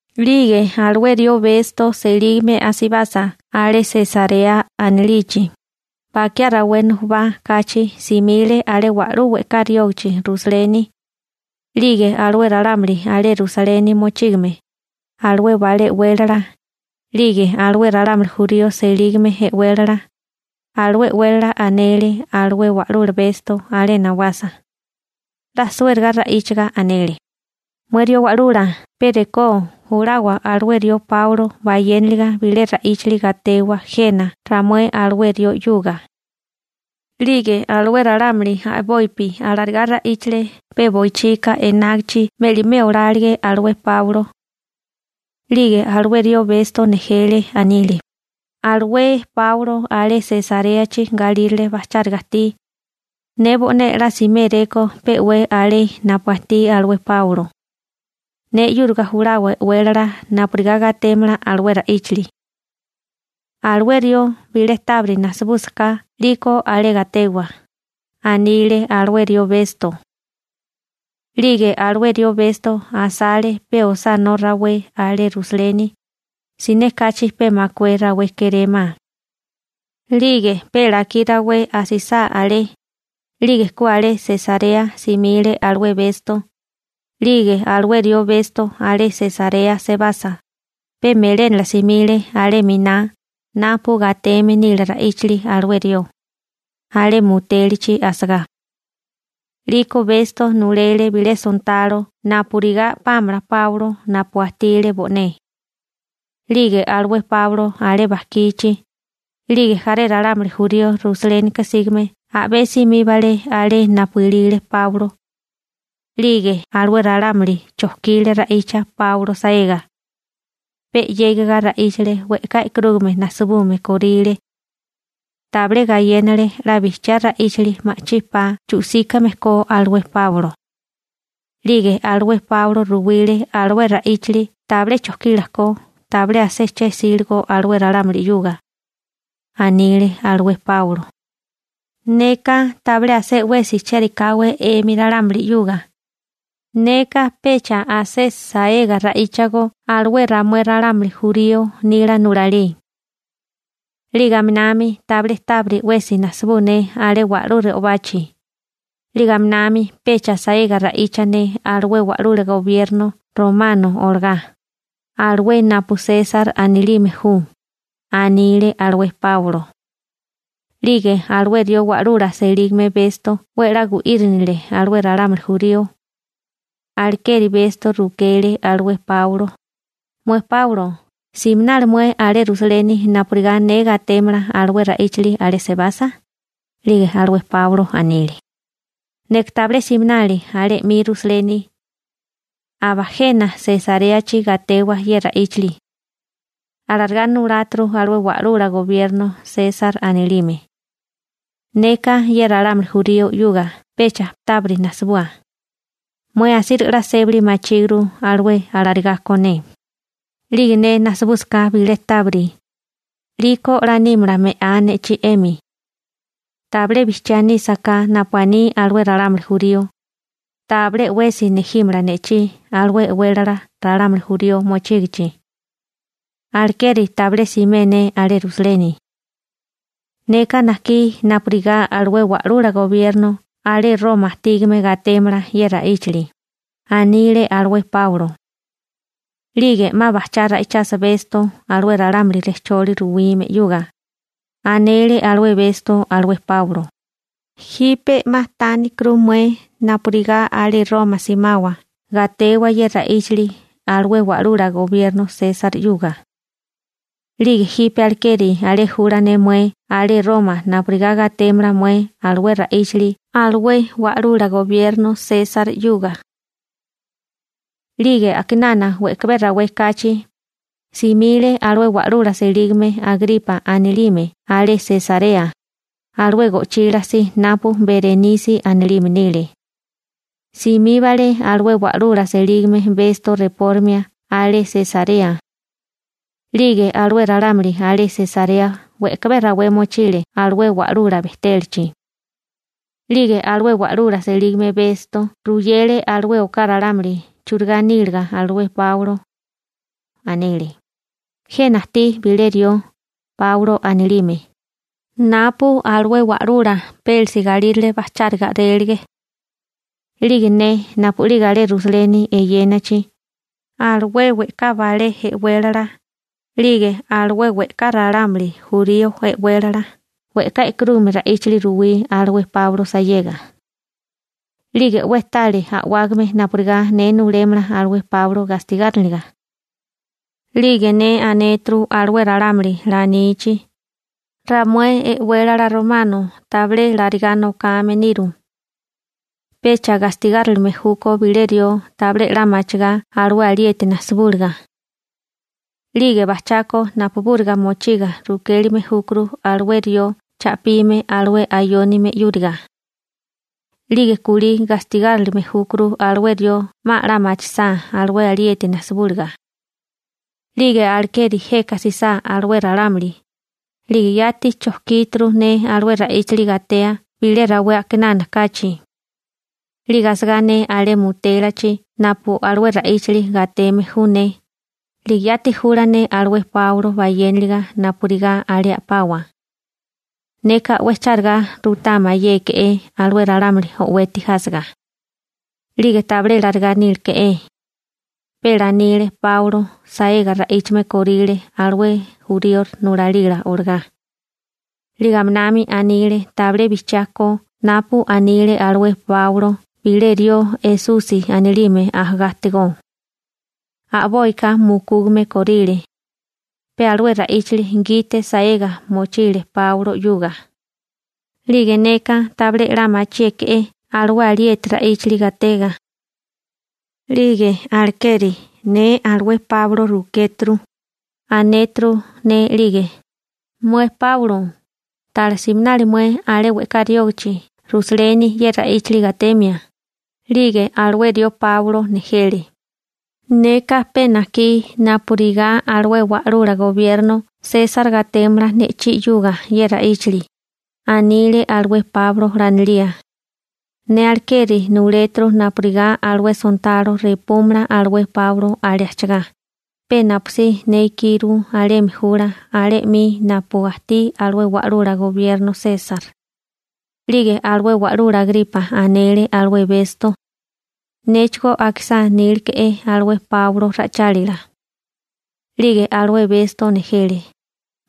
'Lige alué rió Besto selígame asibasa alé Sesarea anilichi, bakiá rawé nujubá kachi simile alé wa'lú we'ká riógichi Rusaleni. 'Lige alué ralámuli alé Rusaleni mochígame, alué balé e'wélala, 'lige alué ralámuli jurío selígame e'wélala, alué e'wélala anele alué wa'lula Besto alé nawasa, 'la suériga ra'íchiga anele: ―Mué rió wa'lula pe rekó julawa alué rió Páulo bayénaliga bilé ra'íchali gatewa jena ramué alué rió 'yuga. 'Lige alué ralámuli a'bopi alarigá ra'íchale pe boichika enágichi me'limé olálige alué Páulo. 'Lige alué rió Besto nejele, anile: ―Alué Páulo alé Sesaréachi galírale bajcháriga ajtí. Ne bo'né 'la siméréko pe'wé alé napu ajtí alué Páulo. Ne 'yúriga julawa e'wélala napurigá gatémala alué ra'íchali. Alué rió bilé tábiri najsibúsaká 'liko alé gatewa ―anile alué rió Besto. 'Lige alué rió Besto asale pe osánó rawé alé Rusaleni, siné kachi pe makué rawé kérémá. 'Lige pe lakí rawé asisá alé, 'lige ku alé Sesarea simile alué Besto. 'Lige alué rió Besto alé Sesarea sebasa, pe melénala simile alé 'miná napu gateme nile ra'íchili alué rió, alé mutélachi asagá. 'Liko Besto nulele bilé sontalo napurigá a'pámala Páulo napu ajtile bo'né. 'Lige alué Páulo alé bajkichi, 'lige jaré ralámuli jurío Rusalénika sígame a'bé simíbale alé napu ilile Páulo. 'Lige alué ralámuli chojkile ra'icha Páulo saega. Pe 'yégiga ra'íchale we'ká e'karúgame najsabume kóríle. Tabilé gayénale 'la bijchiá ra'íchali ma'chí pa chu'síkame ko alué Páulo. 'Lige alué Páulo ruwile alué ra'íchili tabilé chojkila ko, tabilé asé che 'síligo alué ralámuli 'yuga. Anile alué Páulo: ―Neka tabilé asé 'wesi chérikáwé 'emi ralámuli 'yuga, neka pecha asé saega ra'íchago alué ramué ralámuli jurío nila nulalí. 'Lige aminami tabilé tábiri 'wesi najsibú ne alé wa'lú re'obachi. 'Lige aminami pecha saega ra'icha ne alué wa'lula gobierno romano olagá, alué napu Sesar anilime ju ―anile alué Páulo. 'Lige alué rió wa'lula selígame Besto 'we a'lá gu'írinile alué ralámuli jurío. Alekeri Besto rukele alué Páulo: ―Mué Páulo, ¿siminali mué alé Rusaleni napurigá ne gatémala alué ra'íchali alé sebasa? 'Lige alué Páulo anile: ―Neka tabilé siminali alé 'mi Rusaleni. Aba jena Sesaréachi gatewa ye ra'íchali. Alarigá nuláturu alué wa'lula gobierno (bisirente) Sesar anilime. Neka ye ralámuli jurío 'yuga pecha tábiri najsibua. Mué asíriga 'la sébali machíguru alué alarigá ko ne. 'Lige ne najsibúsaká bilé tábiri, 'liko 'la nímala me'á ne'chí 'emi. Tabilé bijchiá nísaká napu aní alué ralámuli jurío, tabilé 'wesi nejímala ne'chí alué e'wélala ralámuli jurío mochígichi. Alekeri tabilé simé ne alé Rusaleni. ¡Neka najkí napurigá alué wa'lula gobierno alé Roma ajtígame gatémala ye ra'íchili! ―anile alué Páulo. 'Lige 'ma bajchá ra'ichasa Besto alué ralámuli rejcholi ruwime 'yuga, anele alué Besto alué Páulo: ―Jipe 'ma tánikuru mué napurigá alé Roma simawa gatewa ye ra'íchali alué wa'lula gobierno Sesar 'yuga. 'Lige jipe alekeri alé jula ne mué alé Roma napurigá gatémala mué alué ra'íchili alué wa'lula gobierno Sesar 'yuga. 'Lige a'kinana we'kabé rawé kachi, simile alué wa'lula selígame Agripa anilime alé Sesarea, alué go'chila si napu Berenisi anilime nile. Simíbale alué wa'lula selígame Besto repórimia alé Sesarea. 'Lige alué ralámuli alé Sesarea we'kabé rawé mochile alué wa'lula bejtélachi. 'Lige alué wa'lula selígame Besto ruyele alué oká ralámuli churigá níliga alué Páulo. Anele: ―Jena ajtí bilé rió, Páulo anilime, napu alué wa'lula Pélisi galírale bajcháriga a'rélige. 'Lige ne napu'lige alé Rusaleni eyénachi, alué we'ká balé e'wélala, 'lige alué we'ká ralámuli jurío e'wélala we'ká e'karúgame ra'íchili ruwí alué Páulo sayega. 'Lige 'we tale a'wágame napurigá ne nulémala alué Páulo gastigáriniliga. 'Lige ne anéturu alué ralámuli 'la anichi: «Ramué e'wélala Romano tabilé larigá nokame niru. Pecha gastigárilime júkó bilé rió tabilé 'la machigá alué alieti najsibúliga. 'Lige bajchako napubúriga mochiga rukélime júkuru alué rió cha'pime alué ayónime 'yúriga. 'Lige kulí gastigárilime júkuru alué rió 'ma a'lá machisá alué alieti najsibúliga.» 'Lige alekeri jeka jsisá alué ralámuli, 'lige yati chojkíturu ne alué ra'íchili gatea bilé rawé a'kinana kachi. 'Lige asagá ne alé mutélachi napu alué ra'íchili gateme ju ne, 'lige yati jula ne alué Páulo bayéniliga napurigá alé a'pawa. Neka 'we chárigá ruimé mayéke'é alué ralámuli o'weti jásiga. 'Lige tabilé larigá níleke'é. Pe lanile Páulo saega ra'íchame kóríle alué jurío nulalila olagá. 'Lige aminami anile tabilé bijchiá ko napu anile alué Páulo bilé rió Esusi anilime ajagá ajtigó. A'boika mukúgame kóríle. Pe alué ra'íchali gite saega mochile Páulo 'yuga. 'Lige neka tabilé 'la machíeke'é alué alieti ra'íchili gatega. 'Lige alekeri ne alué Páulo rukéturu, anéturu ne 'lige: «Mué Páulo, ¿pala 'la siminali mué alé we'ká riógichi Rusaleni ye ra'íchali gatemia?» 'Lige alué rió Páulo nejele: «Neka pe najkí napurigá alué wa'lula gobierno Sesar gatémala ne'chí 'yuga ye ra'íchili», anile alué Páulo lanilía. Ne alekeri nuléturu napurigá alué sontalo repúmala alué Páulo alé ajchagá, pe napusí ne ikiru alemi jula alé 'mi napu ajtí alué wa'lula gobierno Sesar. 'Lige alué wa'lula Agripa anele alué Besto: ―Néchigó akisá níleke'é alué Páulo ra'ichálila. 'Lige alué Besto nejele: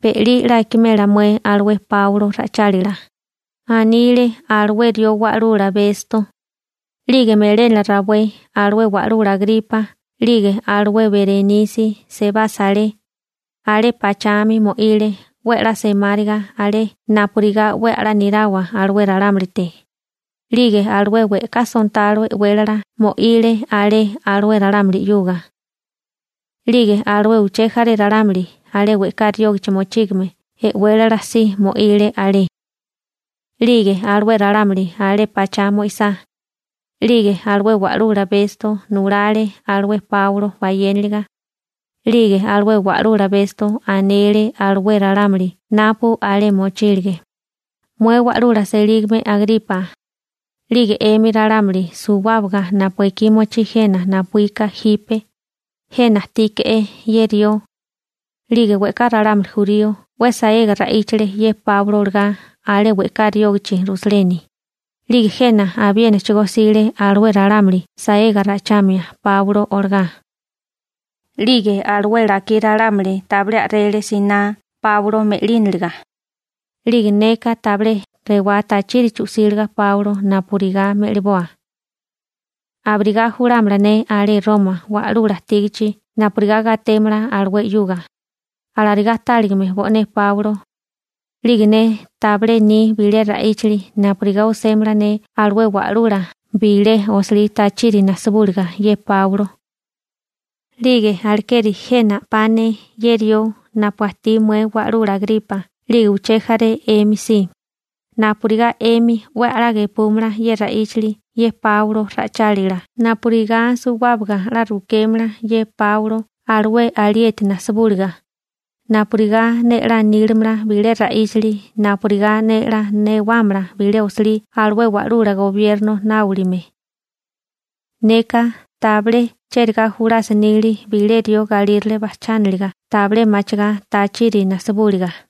―Be'lí 'la akimela mué alué Páulo ra'ichálila ―anile alué rió wa'lula Besto. 'Lige melénala rawé alué wa'lula Agripa 'lige alué Berenisi sebasa alé, alé pachami mo'ile 'we a'lá semáriga alé napurigá 'we a'lá nirawa alué ralámulite, 'lige alué we'ká sontalo e'wélala mo'ile alé alué ralámuli 'yuga. 'Lige alué uché jaré ralámuli alé we'ká riógichi mochígame e'wélala si mo'ile alé. 'Lige alué ralámuli alé pachá mo'isá, 'lige alué wa'lula Besto nulale alué Páulo bayénaliga. 'Lige alué wa'lula Besto anele alué ralámuli napu alé mochílige: ―Mué wa'lula selígame Agripa, 'lige 'emi ralámuli suwábaga napu ekí mochí jena napuíka jipe, jena ajtíke'é ye rió. 'Lige we'ká ralámuli jurío 'we saega ra'íchale ye Páulo olagá alé we'ká riógichi Rusaleni, 'lige jena abiénachigó jsile alué ralámuli saega ra'ichamia Páulo olagá. 'Lige alué lakí ralámuli tabilé a'rele siná Páulo me'línaliga. 'Lige neka tabilé rewá tachiri chu'síligo Páulo napurigá me'liboa. Abirigá julámala ne alé Roma wa'lula ajtígachi napurigá gatémala alué 'yuga, alarigá táligame bo'né Páulo. 'Lige ne tabilé ni bilé ra'íchili napurigá osémala ne alué wa'lula bilé osilí tachiri najsibúliga ye Páulo. 'Lige alekeri jena a'pá ne ye rió napu ajtí mué wa'lula Agripa 'lige uché jaré 'emi si, napurigá 'emi 'we a'lá gepúmala ye ra'íchili ye Páulo ra'ichálila napurigá suwábaga 'la rukémala ye Páulo alué alieti najsibúliga, napurigá ne 'la nílimala bilé ra'íchili napurigá ne 'la newámala bilé osilí alué wa'lula gobierno nábolime. Neka tabilé chérigá julasa nili bilé rió galírale bajchániliga tabilé machigá tachiri najsibúliga.